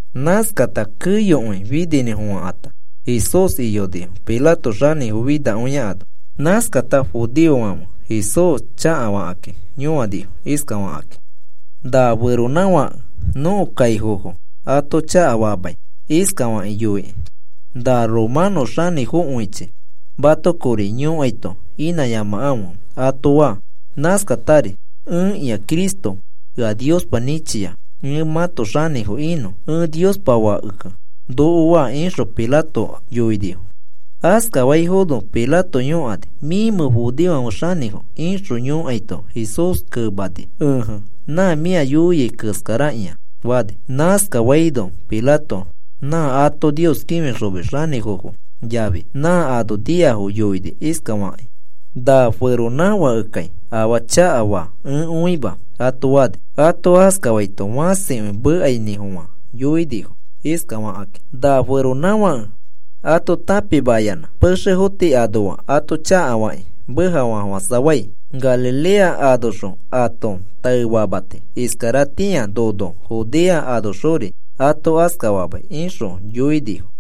Nãskakata keyokõi fininĩfofãkãta Jesús iyonifo Pilato xanĩfo finakõia ano. Nãskakata judeofãfe Jesús chakafakakĩ yõanifo iskafakakĩ: “Na feronãfãke nõko kaifofo ato chakafamai iskafakĩ yoikĩ: ‘Na romanõ xanĩfokõichi mato kori yõkaito inãyamakãfe,’ ato faa. Nãskatari, ‘Ẽkĩa Cristo, ea Niospa nĩchia ẽ mãto xanĩfo inõ. Ẽ Niospa Fake,’ noko faa,” ixõ Pilato yoinifo. Askafaifono Pilato yõkani: “¿Mĩmẽ judeofãfe xanĩfo?” ixõ yõkaito Jesús kemani: “Ẽje, nã mĩ ea yoiai keskarakĩa,” fani. Nãskafaino Pilato nã ato Nios kĩfixomis xanĩfofo yafi nã ano niafo yoini iskafakĩ: “Na feronãfãkekai afaa chakafaa ẽ õima,” ato fani. Ato askafaito fãsikõi mekainĩfofã yoinifo iskafakakĩ: “Na feronãfãke ato tãpimayanã pexefo tii anoa ato chakafakĩ mekafamafofãsafai. Galilea anoxõ ato taefamati, iskaratĩa nono Judea anoxori ato askafamai,” ixõ yoinifo.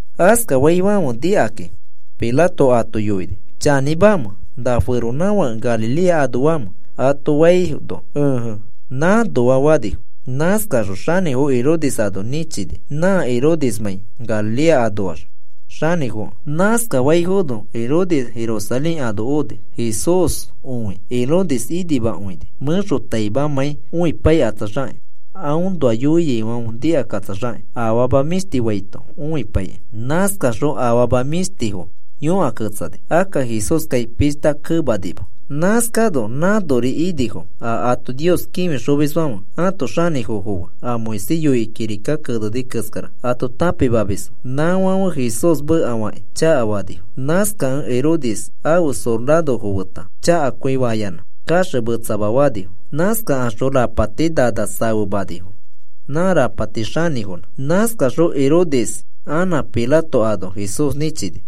Askafaifãfe nikakĩ Pilato ato yoini: “¿Chanĩmamẽ na feronãfake Galilea anoamẽ?” ato faino, “Ẽje, nãnoa,” fanifo. Nãskaxõ xanĩfo Herodes ano nĩchini, nã Herodesmãi Galilea anoax xanĩfokẽ. Nãskafaifono Herodes Jerusalén ano oni. Jesús õi Herodes inimakõini, mẽxotaimamãi õipaikatsaxakĩ, aõnoa yoiaifãfe nikakatsaxakĩ afama mĩshti faito õipaikĩ. Nãskaxõ afama mĩshtifo yõkaketsani. Akka Jesúskai pishta kemanima. Nãskano nãnori inifo, a ato Nios kĩfixomisfãfe ãto xanĩfofo fe a Moisés yoikĩ kirika keneni keskara ato tãpimamisfo, nãfãfe Jesús mekafakĩ chakafanifo. Nãskakẽ Herodes ãfe sorarofo feta chakakõifayanã kaxemetsama fanifo. Nãskakaxõ rapati nana safemanifo nã rapati xanĩfonã. Nãskaxõ Herodes anã Pilato ano Jesús nĩchini.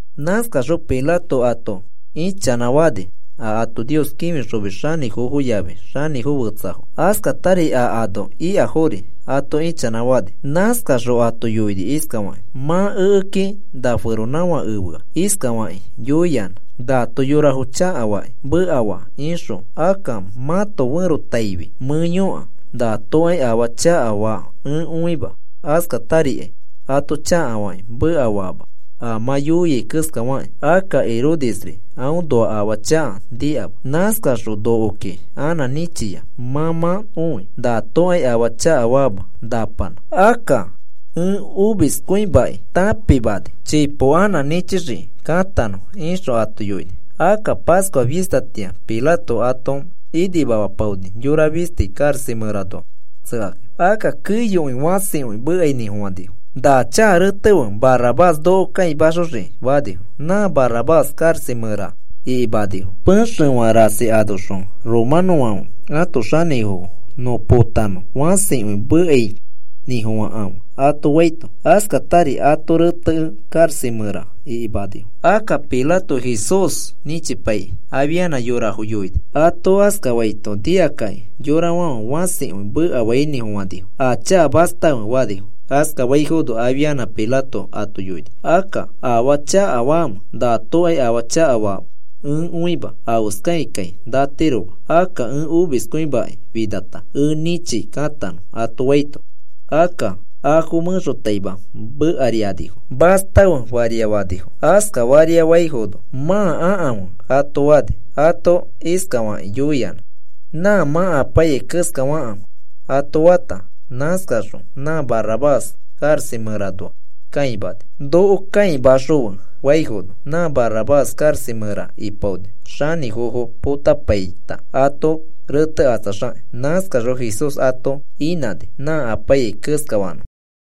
Nãskaxõ Pilato ato ichanãfani a ato Nios kĩfixomis xanĩfofo yafi xanĩfo fetsafo, askatari a ano ikafori ato ĩchanãfani. Nãskaxõ ato yoini iskafakĩ: “Mã ekeki na feronãfake efea iskafakĩ yoiyanã: ‘Nato yorafo chakafakĩ mekafa,’ ixõ. Akka mãto ferotaifi mẽ yõka. Natokai afaa chakafa ẽ õima, askatarikai ato chakafakĩ mekafaama a mã yoiai keskafakĩ. Akka Herodesri aõnoa afaa chaka nikama. Nãskaxõ nokoki anã nĩchia. Mã mã õi natokai afaa chakafaama napanã. Akka ẽ omiskõimakĩ tãpimani, chipo anã nĩchixiki katanõ,” ixõ ato yoini. Akka Pascua fistatĩa Pilato ato inimamapaoni yora fisti karaxa mẽranoa tsekakĩ. Akka keyokõi fãsikõi mekainĩfofãnifo. “¡Na chaka retefe, Barrabás noko kãimaxoxiki!” fanifo. Nã Barrabás karaxa mẽra ikimanifo pexefã rasi anoxõ romanõfãfe ãto xanĩfo nõ potanõ fãsikõi mekainĩfofãkãfe ato faito. Askatari ato retekẽ karaxa mẽra ikimanifo. Akka Pilato Jesús nĩchipaikĩ, afianã yorafo yoini. Ato askafaito nikakakĩ yorafãfe fãsikõi mekafainĩfofãnifo: “¡A chaka mastafe!” fanifo. Askafaifono afianã Pilato ato yoini: “Akka, ¿afaa chakafamẽ? Natokai afaa chakafa ẽ õima. Afeskaikai natiroma. Akka ẽ omiskõimakĩ finata ẽ nĩchi katanõ,” ato faito, akka afo mẽxotaima mekarianifo. “¡Mastafe!” faria fanifo. Askafaria faifono, “Mãa akãfe,” ato fani. Ato iskafakĩ, yoiyanã, “Nã mã apaiyai keskafakãfe” ato fata, nãskaxõ nã Barrabás karaxa mẽranoa kãimani, “Noko kãimaxõfe,” faifono. Nã Barrabás karaxa mẽra ipaoni xanĩfofo potapaita ato retekatsaxakĩ. Nãskaxõ Jesús ato inãni nã apaiyai keskafanõfo.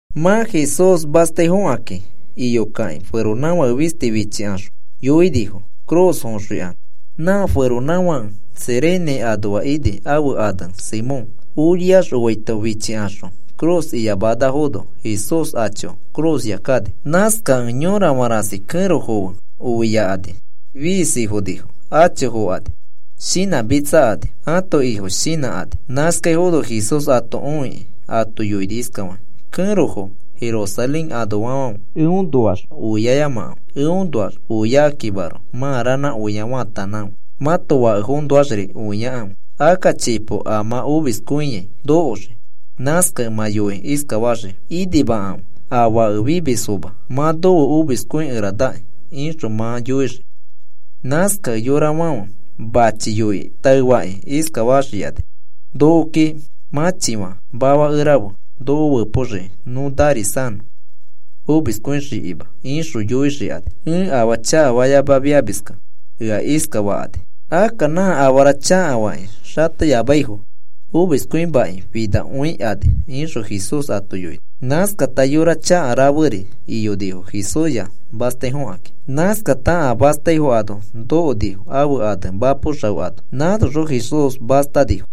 Mã Jesús mastaifokakĩ iyokakĩ, feronãfake fisti fichikaxõ yoinifo cruz foxõikanõ. Nã feronãfake Cirene anoa ini, ãfe ane Simón. Oriax oaito fichikaxõ cruz iyamanafono Jesús acho cruzya kani. Nãskakẽ yorafã rasi kẽrofo fe oiakani, fiisi fonifo. Acho fokani, shinãmitsakani ãto Ifo shinãkani. Nãskaifono Jesús ato õikĩ ato yoini iskafakĩ: “Kẽrofo Jerusalén anoafofãfe, eõnoax õiayamakãfe, eõnoax õiakĩmaroko mãa ranã oia faatanãkãfe, mãto fakefoõnoaxri oiakãfe. Akka chipo a mã omiskõiai nokoxii, nãskakẽ mã yoikĩ iskafaxii: ‘Inimakãfe a fake fimisfoma, mã nofe omiskõikeranaki,’ ixõ mã yoixii. Nãskakẽ yorafãfe machi yoikĩ taefakĩ iskafaxikani: ‘Nokoki mãchifã mafakerafe noko fepoxiki nõ narisanõ omiskõixikima,’ ixõ yoixikani. Ẽ afaa chakafayamafiamiskẽ ea iskafakani. Akka nã afara chakafakĩ xateyamaifo omiskõimakĩ finakõikani,” ixõ Jesús ato yoini. Nãskata yora chaka raferi iyonifo Jesúsya mastaifokakĩ. Nãskata a mastaifo ano nokonifo ãfe ane Mapo Xao ano. Nãnoxõ Jesús mastanifo.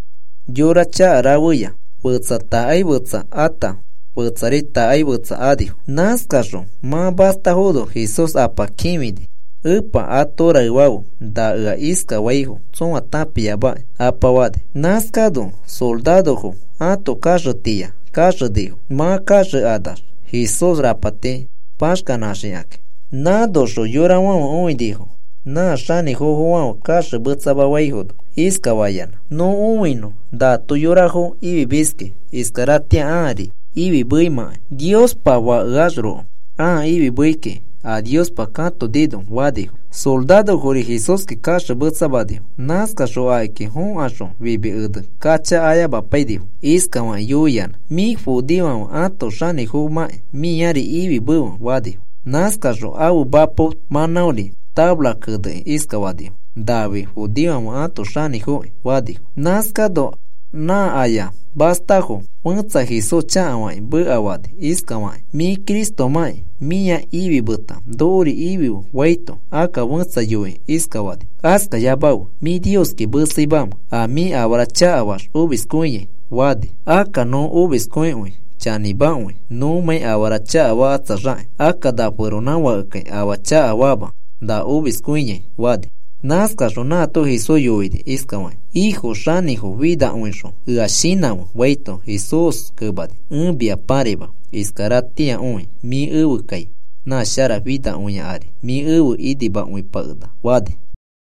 Yora chaka rafeya fetsa takaifetsa ata, fetsari takaifetsa anifo. Nãskaxõ mã mastafono Jesús Apa kĩfini: “Epa, ato raefafe na ea iskafaifo tsõa tãpiamakĩ,” Apa fani. Nãskano sorarofo ato kaxetiya kaxenifo mã kanãkanax Jesús rapati paxkanãxikakĩ. Nãnoxõ yorafãfe õinifo. Nã xanĩfofofãfe kaxemetsamafaifono iskafayanã: “Nõ õinõ nato yorafo ifimiski, iskaratĩa ãari ifimeimãkai. Niospa Fakeaxroko ãa ifimei kiki a Niospa katonino,” fanifo. Sorarofori Jesúski kaxemetsamanifo. Nãskaxõ akiki fokaxõ fimi ene kacha ayamapainifo. Iskafakĩ yoiyanã: “Mĩ judeofãfe ãto xanĩfomãkĩ mĩari ifimefe,” fanifo. Nãskaxõ ãfe mapo mãnãori tafara kenekĩ iskafanifo: “Nafi judeofãfe ãto Xanĩfoki,” fanifo. Nãskano nã aya mastafo fẽtsa Jesús chakafakĩ mekafani iskafakĩ: “Mĩ Cristomãkĩ mĩa ifimeta nokori ifife,” faito, akka fẽtsa yoikĩ iskafani: “Askafayamafe. ¿Mĩ Nioski meseimamẽ a mĩ afara chakafaax omiskõiai?” fani. “Akka nõ omiskõikõi chanĩmakõi nõmãi afara chakafakatsaxakĩ. Akka na feronãfakekai afaa chakafama na omiskõiai,” fani. Nãskaxõ nãato Jesús yoini iskafakĩ: “Ifo, xanĩfo finakõixõ ea shinãfe,” faito, Jesús kemani: “Ẽ mia pãraima iskaratĩakõi mĩ efe kai nã sharafinakõia ari mĩ efe inimakõipakenaka,” fani.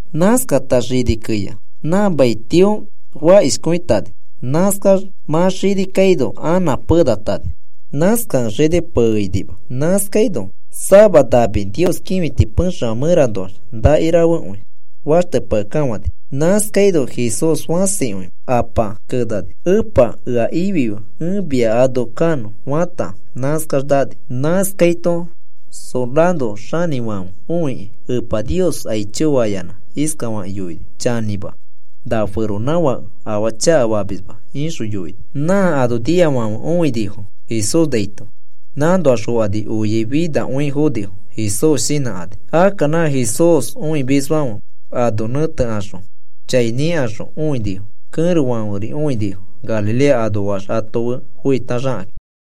Nãskata xini keya nã mai tio fakishifãkõitani. Nãskax mã xini kaino anã penatani. Nãskakẽ xini peinima. Nãskaino sama nami Nios kĩfiti pexefã mẽranoax nakirafekõi faxtepakekafãni. Nãskaino Jesús fãsikõi Apa kenani: “Epa, ea ifife ẽ mia ano kanõ,” fata, nãskax nani. Nãskaito soraro xanĩfãfe õikĩ, Epa Nios aicho fayanã iskafakĩ yoini: “Chanĩma, na feronãfake afaa chakafamisma,” ixõ yoini. Nã ano niafãfe õinifo Jesús naito. Nãnoax fokani, oiai finakõi fonifo Jesús shinãkani. Akka nã Jesús õimisfãfe ano nẽtekaxõ chai nikaxõ õinifo. Kẽrofãferi õinifo, Galilea anoax afe foitaxakakĩ.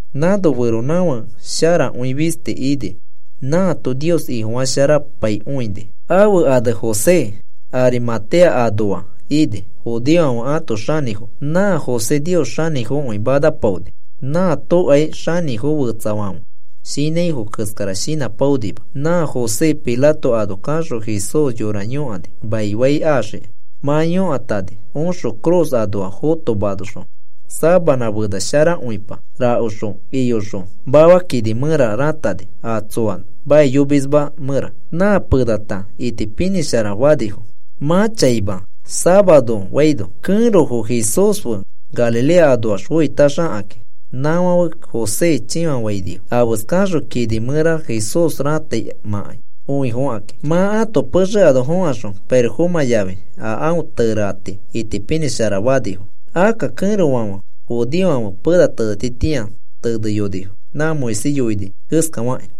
Nãno feronãfake sharakõi fisti ini. Nãato Nios Ifofasharapaikõini. Ãfe ane José, Arimatea anoa ini judeofãfe ãto xanĩfo. Nã José Nios xanĩfokõi manapaoni. Nãatokai xanĩfo fetsafãfe shinãifo keskara shinãpaonima. Nã José Pilato ano kaxõ Jesús yora yõkani maifai axiki. Mã yõkatani oxõ cruz anoa fotomaxõ sabanã fena sharakõipa rakoxõ iyoxõ mafa kini mẽra rãtani, a tsoa maiyomisma mẽra. Nã penata itipinĩshara fanifo, mã chaima safaro faino, kẽrofo Jesús fe Galilea anoax foitaxakakĩ. Nãfãfe José chĩfafainifo afeskaxõ kini mẽra Jesús rãtaimãkai õifokakĩ. Mã ãto pexe ano fẽkaxõ, pirofomã yafi a aõ tereati itipinĩsharafanifo. Akka kẽrofãfe judeofãfe pena tenetitĩa teneyonifo nã Moisés yoini keskafakĩ.